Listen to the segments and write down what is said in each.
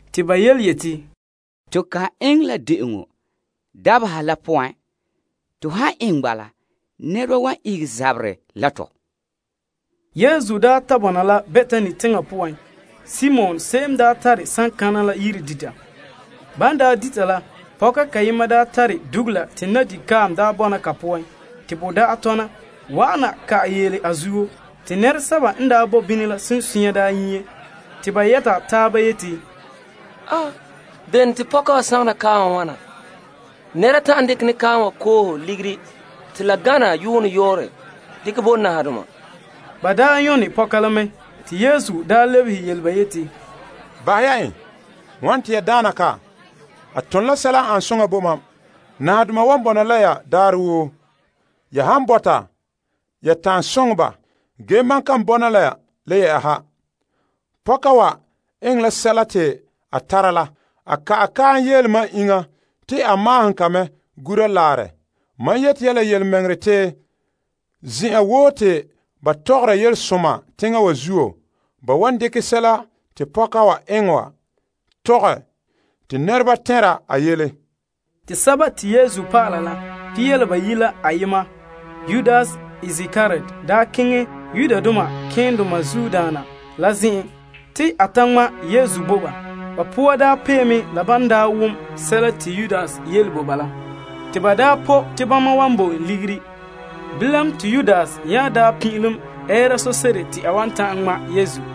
Te ba yeti, To kan eŋɛ la de'eŋɔ dabeha la poan. To han eŋɛ bala, nɛreba wan ihege zaberɛ la tɔ. Yesu daa ta bɔna la Betani teŋa poan Simon konkonɛ la yire dita. Ban dita la, pɔka kayema n tare dugula la kaam n tare nyuŋo soŋɔ te bo da'a tɔna, wa'ana ka'ɛ yeele a zuo. Te nɛresɛba n bo bini la sunsunya nyie te ba yɛta taaba yeti, Bene to pɔka wa sagona kaam wa wana wa? Nɛra ta'an dekɛ ne kaam wa koohe ligiri te la gana yuune yɔɔrɛ dekɛ bo nahadoma. Te ba nyɔne pɔka la mɛ. Te Yesu lebehe ba yeti, Bahɛ ya en. Wane te ya daana ka? A ton la sɛla n ane soŋa bo mam. Nahadoma wan bɔna la ya daarɛ. Ya han bɔta, ya ta'an soŋɛ ba. Ge mam kan bɔna la ya le yɛ'ɛha. Pɔka wa eŋɛ la sɛla te a tara la. A ka'ɛ kaam yeele mam iŋa te a maahom ka me gura laarɛ. Mam yeti ya la yelemɛŋɛrɛ te zen'an woo te ban mɔɔla yelesoma teŋa wa zuo, ba wan dekɛ sɛla te pɔka wa eŋɛ wa tɔgɛ te nɛreba tɛnra a yele. Te Pia La Bayi' la ayema, Yudas Iskariot daa keŋɛ malema keendoma la zen'en te a ta ŋma' Yesu bo ba. Ba poa daa pee mɛ la ban daa wom sɛla te Yudas yele ba la, te ba daa pɔ' te bama wan bo en ligiri. Bilam te Yudas nya daa pin'ilom ɛɛra so'se'ere te a wan ta'an ŋma' Yesu.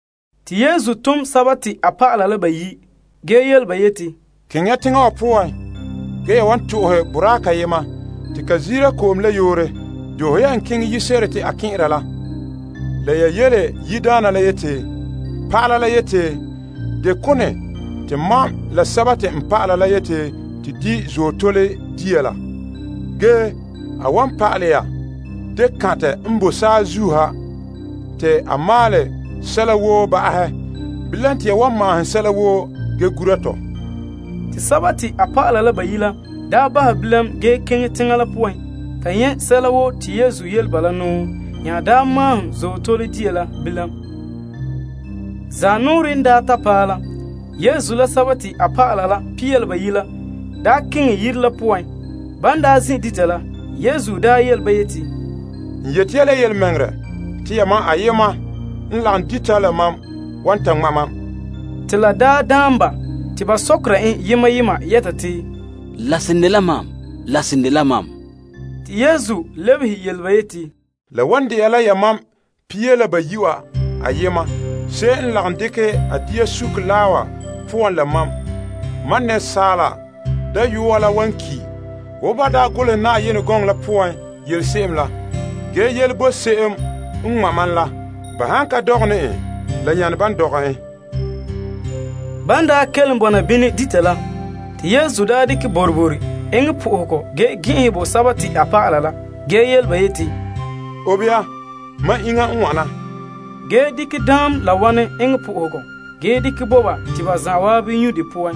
Te Yesu tom a dɔlɔba bayi' ge yele ba yeti, Keŋɛ ya teŋa poan ge ya wan to'ohɛ boraa kayema te ka ziire ko'om la yoore. Doohe ya en. Keŋɛ yire se'ere te a kɛn'ɛra la, la ya yele yiredaana la yeti, Pa'ala la yeti, deo la bɛɛ te mam la mam dɔlɔba la di' Azootole dia la? Ge a wan pa'alɛ ya dekantɛ n boe saazuo ha te a maalɛ sɛla woo ba'ahɛ. Bilam te ya wan maahom sɛla woo ge gura to. Te a dɔlɔba la bahɛ bilam ge keŋɛ teŋa la poan ta nyɛ' sɛla woo te Yesu yele ba la nya maahom Azootole dia la bilam. Zaanɔɔrɛ n daa ta paɛ la, Yesu la Pia La Bayi' la keŋɛ yire la poan. Ban zin' dita la, Yesu ta yele ba yeti, N yeti ya la yelemɛŋɛrɛ te ya ayema n lagom dita la mam wan ta ŋma' mam. Te la daan ba, te ba sɔkera en yema yema yɛta te, La seren dela mam? Yesu lebehe ba yeti, La wan de'a la yamam Pia La Bayi' wa ayema se'em n lagom dekɛ a dia suke laa wa poan la mam. Asaala Dayɔa la wan ki' wo ban daa golehɛ Yenɛ gɔŋɔ la poan yele se'em la. Ge yele bo se'em n ŋma' ma la. Ba han ka dɔgɛ ne en, la nyane bo en ban dɔgɛ en. Ban daa kelom bɔna bini dita la, te Yesu dekɛ boroboro bo Yenɛ fara ge gɛn'ɛnhɛ bo a dɔlɔba la ge yele ba yeti, Obe ya, mam iŋa n wana. Ge a nya dekɛ daam la wanɛ bo Yenɛ fara ge dekɛ bo ba te ba zan'an nyu' de poan.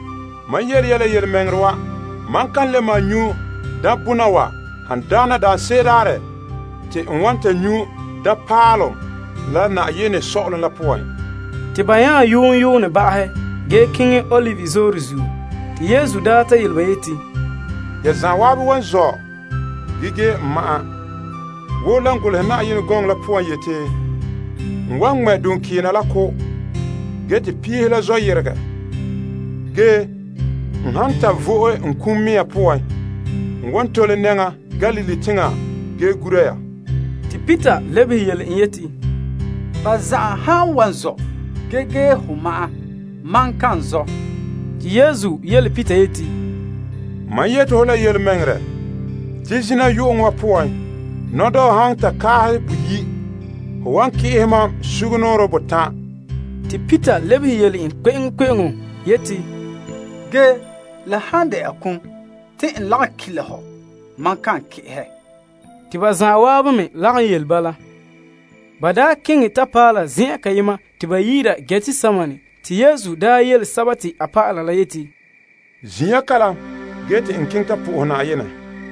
Mam yele ya la yelemɛŋɛrɛ wa, mam ka le malom nyu' daambona wa han dagɛna daanse'ere daarɛ te n wan ta nyu' daam paalom la Yenɛ sɔ'ɔlom la poan. Ban nya yoon yoonɛ ba'ahɛ ge ba yehe keŋɛ Olive Zooren. Yesu daa ta yele ba yeti, Ya zan'an wan zɔ' ge gee mam ma'an, wo lan golehɛ yeti, N wan ko' duŋkeena, te piihe la zɔ yeregɛ. Ge n han ta vo'e n kum mea poan, n wan tole nɛŋa Galilee teŋa ge gura ya. Peter lebehe yele en yeti, Ba zan'an han wan zɔ' ge gee ho ma'an, mam kan zɔ'. Yesu yele Peter yeti, Mam yeti ho la yelemɛŋɛrɛ, te zina yu'uŋɔ wa poan, nɔdɔɔ han ta kaahɛ boyi', ho wan ki'ehɛ mam sugumnɔɔren botan'. Te Peter lebehe yele en kpe'eŋkpe'eŋo yeti, Ge la han de'a kum te n lagom ki' la hɔ, mam kan ki'ehɛ. Te ba zan'an me lagom yele bala. Ba daa keŋɛ ta paɛ la zen'an te ba yi'ira Getsemane, te Yesu yele a dɔlɔba la yeti, Zin' ya kalam ge te n keŋɛ ta soha Na'ayenɛ.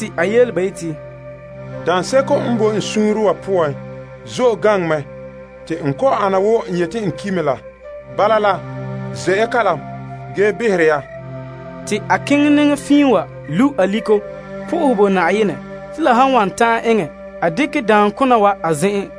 A yele ba yeti, Daanseko n boe n suunre wa poan zo'e gaŋɛ mɛ te n kɔ'ɔn ana wo n yeti n ki' mɛ la. Bala la, ze' ya kalam, gee behera ya. Te a keŋɛ nɛŋa fiin wa lu' aliko sohɛ Yenɛ te la han wan ta'an eŋɛ a dekɛ daamkona wa a zen'an.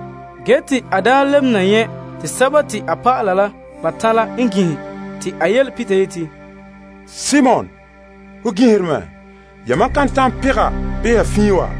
Te a nya lebe na n nyɛ' te a dɔlɔba la batan' la ginhe te a yele Peter yeti, Simon, ho ginhere mɛ? Yamam ka ta'an pegɛ beha fiin wa?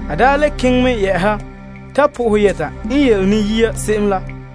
A le keŋɛ me yɛ'ɛha ta sohɛ Yenɛ yɛta en yele ne yia se'em la.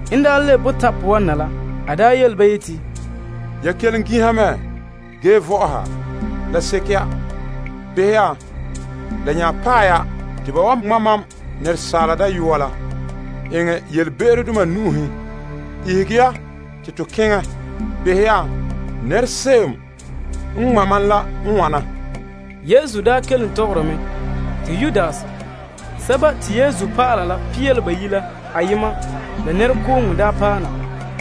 En lebe botan' poan na la, a yele ba yeti, Ya kelom ginha mɛ ge vɔ'ɔha? La seke ya! Behɛ ya, la nya paɛ ya, te ba wan ŋma' Asaala Dayɔa la eŋɛ yelebe'erodoma nu'uhen. Ihege ya te to keŋɛ! Behɛ ya, nɛra se'em n ŋma' mam la, n wana! Yesu n daa kelom tɔgɔra mɛ, Yudas Pia La Bayi' la ayema la paɛ na.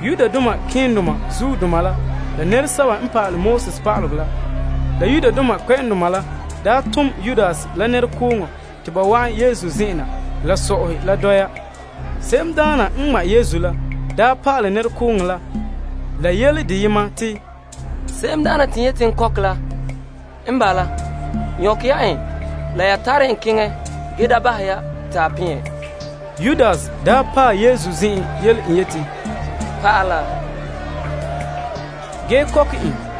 Nɛrekooŋɔ sɛba te malema keendoma la pa'alegɔ pa'aleba la Yudoma kpɛ'ɛndoma la n daa tom la dole en te ba wa'an Yesu zen'en na la so'ahe la dambama. Se'emdaana n ŋma' Yesu la daa pa'alɛ nɛrekooŋɔ la yele deyema te, Se'emdaana te n yeti n kɔkɛ la n bala. Nyɔkɛ ya en la ya tare en keŋɛ ge da bahɛ te a peɛn. Yudas paɛ Yesu zen'an yele en yeti, Naa! Te a kɔkɛ en.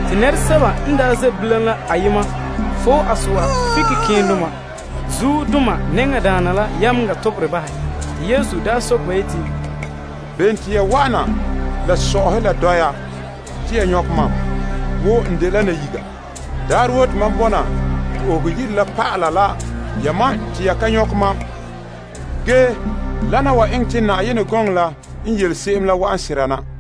Nɛresɛba n daa ze' bilam la ayema foe a so'a fike malema nɛŋadaana la yameŋa toberɛ bahɛ. Yesu yeti, Bene te ya wa'ana la so'ahe la dɔya te ya nyɔkɛ mam wo n dela nayiga? Daarɛ woo te mam bɔna Yenɛ Yire la pa'ala la yamam te ya ka nyɔkɛ mam. Wana wa eŋɛ te Yenɛ gɔŋɔ la n yele se'em la wa'an sera na.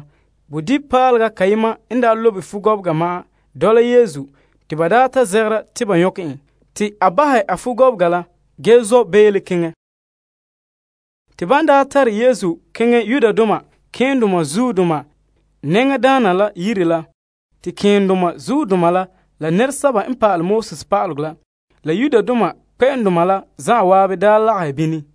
Bodibipaalega kayema n lobe fugɔbega ma'an dɔla Yesu te ban ta zegera te ba nyɔkɛ en, a bahɛ a fugɔbega la me ge zɔ' beele keŋɛ. Ba daa tare Yesu keŋɛ malema nɛŋadaana la yire ge te malema keendoma la pa'alegɔ pa'aleba la Yudoma kpɛ'ɛndoma la zan'an daa lagahɛ bini.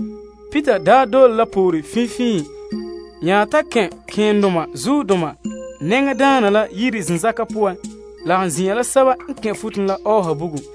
Peter dole la poore finfiin nya ta kɛn' malema nɛŋadaana la yire zenzakan poan lagom zin'an la sɛba n kɛn' la ɔɔha bugum.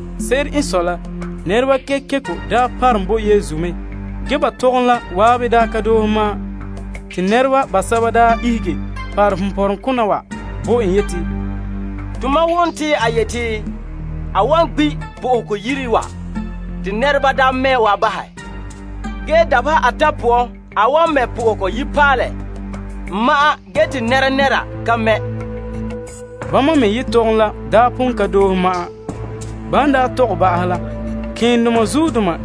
Se'ere n sɔe la, nɛreba kekeko daa parom bo la Yesu, ge ba tɔgom la zan'an ka doohe ma'an. Te nɛreba basɛba daa ihege parom ponpɔrɔŋkona wa bo en yeti, Tomam wom te a yeti, Mam wan gbi' Yenɛ Yire wa te nɛreba mɛ' wa bahɛ, ge dabeha atan' poan n wan mɛ' Yenɛ Yire n ma'an ge te nɛnɛra ka mɛ'. Bama me yetɔgom la daa pon ka doohe ma'an. Malema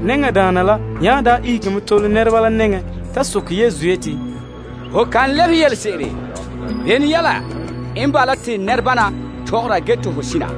nɛŋadaana la nya daa ihege mɛ tole nɛreba la nɛŋan to soke Yesu yeti, Ho kan lebehe yelese'ere? Bene yɛla n bala te nɛrebana tɔgɔra ge te ho sina?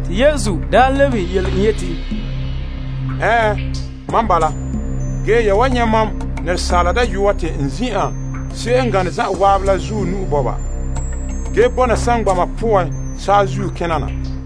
Yesu yeti, Ɛɛn, mam bala. Ge ya wan nyɛ' Asaala Dayɔa te n zin'an Paŋadaana la zuɔ nu'o ge bɔna saŋgbana poan saazuo kena na.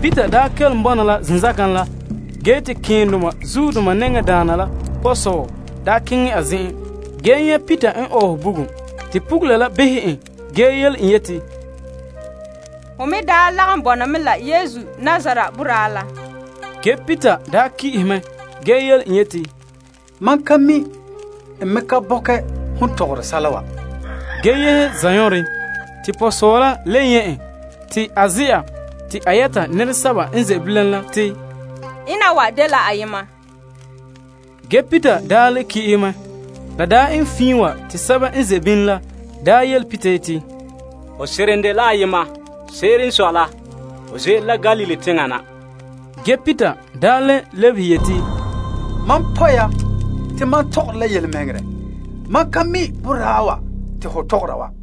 Peter n daa kelom bɔna la zenzakan la, te malema nɛŋadaana la pɔgɔsɔɔ daa keŋɛ a zen'en. En nyɛ' Peter n ɔɔhe bugum, pugula behɛ en ge yele en yeti, Hon me daa lagom bɔna me la Yesu Nazaret boraa la. Ge Peter ki'ehɛ mɛ ge yele en yeti, Mam ka mi', bii n ka bɔkɛ hon tɔgɔre sɛla wa. Ge te a yehe zanɔɔren. Te pɔgɔsɔɔ la n le nyɛ' en te a ze'a, a yɛta nɛresɛba n ze' bilam la te, Ena wa dela ayema. Ge Peter le ki'ehe mɛ. La eŋɛ fiin wa te sɛba n daa ze' bini la yele Peter yeti, Ho seren dela ayema. Se'ere n sɔe la, ho ze'ele la Galilee teŋa na. Ge Peter le lebehe yeti, Mam pɔ' ya te mam ka mi' boraa wa te ho tɔgɔra wa.